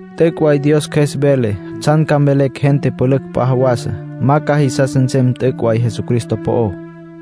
T'üc' way Dios Cjües vele tsjan ca mvelecj gente pülücj p'a jawasa. Ma ca jisas nsem t'üc' way Jesucristo po'ó.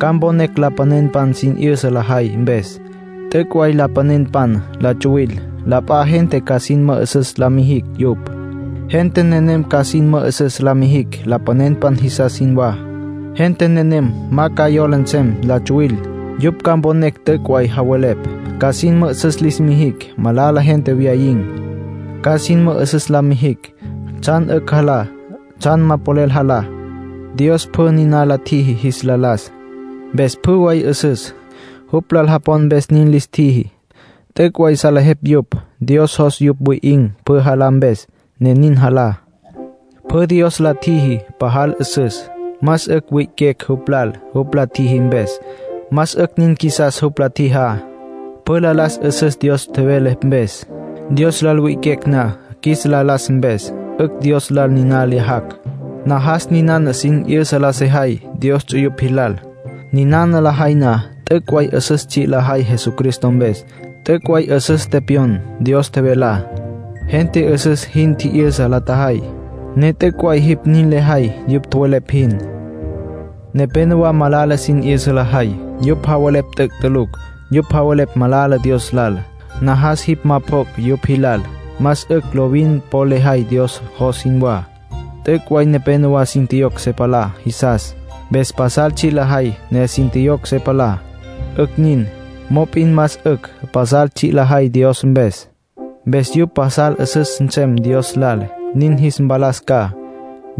Ca mponecj lapanenpan sin 'yüsa lajay mpes. T'üc' way lapanenpan la tsuwil. La p'a gente ca sin mü'üsüs la mijicj yupj. Gente nenem ca sin mü'üsüs la mijicj lapanenpan jisas jinwá. Gente nenem ma ca yola nsem la tsuwil. Yupj ca mponecj t'üc' way javelepj. Ca sin mü'üsüs lis mijicj malala gente wyayin̈. Ca sin mü'üsüs la mijicj tsjan 'ücj jalá, tsjan ma polel jalá. Dios pjü niná la tjiji jis la las, mpes pjü way 'üsüs. Jupj lal japon mpes nin lis tjiji. T'üc' way salejepj yupj. Dios jos yupj wi'in̈ pjü jalá mpes, ne nin jalá. Pjü Dios la tjiji pasal 'üsüs. Más 'ücj wi'iquecj jupj lal jupj la tjiji mpes, más 'ücj nin qjuisas jupj la tjijá. Pjü la las 'üsüs Dios tjevele mpes. Dios lal wi'iquecj na qjuis la las mpes, 'ücj Dios lal niná lyajacj. Najas ninana sin 'yüsa la sejay Dios ts'uyupj jilal. Niná lejay na, t'üc' way 'üsüs tsji' lejay Jesucristo mpes. T'üc' way 'üsüs tepyon Dios tjevelá. Gente 'üsüs jin tji'yüsa la tjajay, ne t'üc' way jipj nin lejay yupj tjowelepj jin. Nepénowa malala sin 'yüsa lajay. Yupj javelepj t'üc' tulucj. Yupj javelepj malala Dios lal. Najas jipj ma pjoc' yupj jilal. Más 'ücj lovin po lejay Dios jos jinwá. T'üc' way nepénowa sin tjiyocj se palá jisas. Mpes pasal tsji' lajay, ne sin tjiyocj se palá. 'Ücj nin. Mop'in más 'ücj pasal tsji' lajay Dios mpes. Mpes yupj pasal 'üsüs nsem Dios lal, nin jis mpalas ca.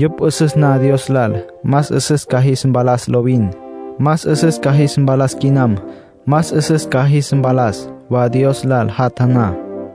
Yupj 'üsüs na Dios lal, más 'üsüs ca jis mpalas lovin. Más 'üsüs ca jis mpalas quinam, más 'üsüs ca jis mpalas wa Dios lal jatja na.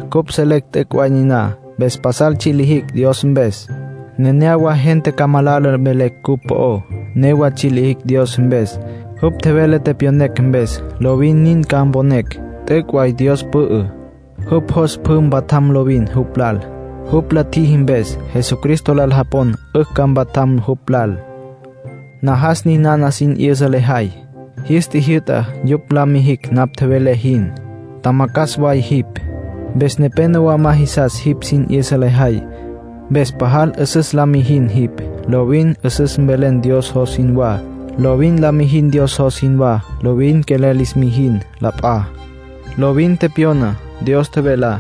Cupj selecj t'üc' way niná. Mpes pajal tsji' lijicj Dios mpes. Nenéyawa gente ca malala mvelecj cupj po'ó; newa tsji' lijicj Dios mpes, jupj tjevele tepyonecj mpes. Lovin nin ca mponecj. T'üc' way Dios pü'ü. Jupj jos pjü mpatjam lovin jupj lal. Jupj la tjiji mpes, Jesucristo lal japon 'ücj ca mpatjam jupj lal. Najas ninana sin 'yüsa lejay. Jis tjijyü'ta yupj la mijicj napj tjevelé jin. Tjamacjas way jipj, mpes nepénowa ma jisas jipj sin 'yüsa lejay. Mpes pajal 'üsüs la mijin jipj. Lovin 'üsüs mvelen Dios jos jinwá. Lovin la mijin Dios jos jinwá. Lovin quelel lis mijin la p'a. Lovin tepyona Dios tjevelá.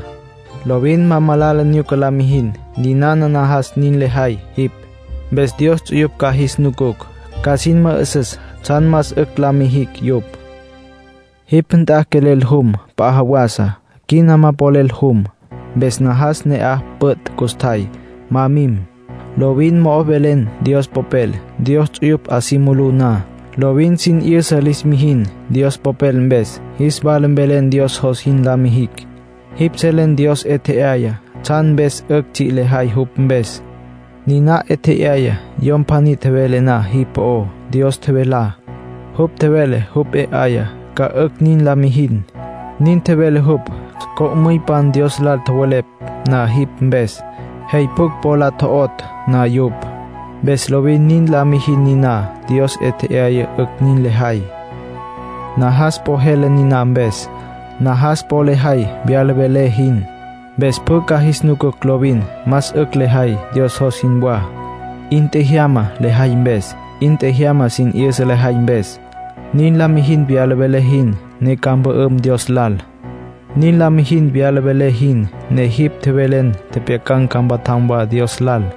Lovin ma malala nyuca la mijin. Ninana najas nin lejay jipj. Mpes Dios ts'uyupj ca jis nucucj, ca sin mü'üsüs tsjan más 'ücj la mijicj yupj. Jipj nt'a quelel jum p'a jawasa, quina ma polel jum. Mpes najas ne'aj püt' custjay, ma mim. Lovin mo'o mvelen Dios Popel Dios ts'uyupj 'a si mulú na. Lovin sin 'yüsa lis mijin Dios Popel mpes. Jis wala mvelen Dios jos jin la mijicj. Jipj selen Dios 'e tje'aya tsjan mpes 'ücj tsji' lejay jupj mpes. Niná 'e tje'aya yom pjaní tjevele na jipj po'ó Dios tjevelá. Jupj tjevele jupj 'e 'aya ca 'ücj nin la mijin. Nin tjevele jupj, co'müypan Dios lal tjowelepj na jipj mpes, jey pjucj po la tjo'otj na yupj. Mpes lovin nin la mijin niná Dios 'e tje'aya 'ücj nin lejay. Najas po jele niná mpes. Najas po lejay wyala velé jin. Mpes pjü ca jis nucucj lovin más 'ücj lejay, Dios jos jinwá. 'In tjejyama lejay mpes. 'In tjejyama sin 'yüsa lejay mpes. Nin la mijin wyala velé jin, ne ca mpü'üm Dios lal. Nin la mijin wyala velé jin, ne jipj tjevelen tjepjyacan̈ ca mpatjam wa Dios lal.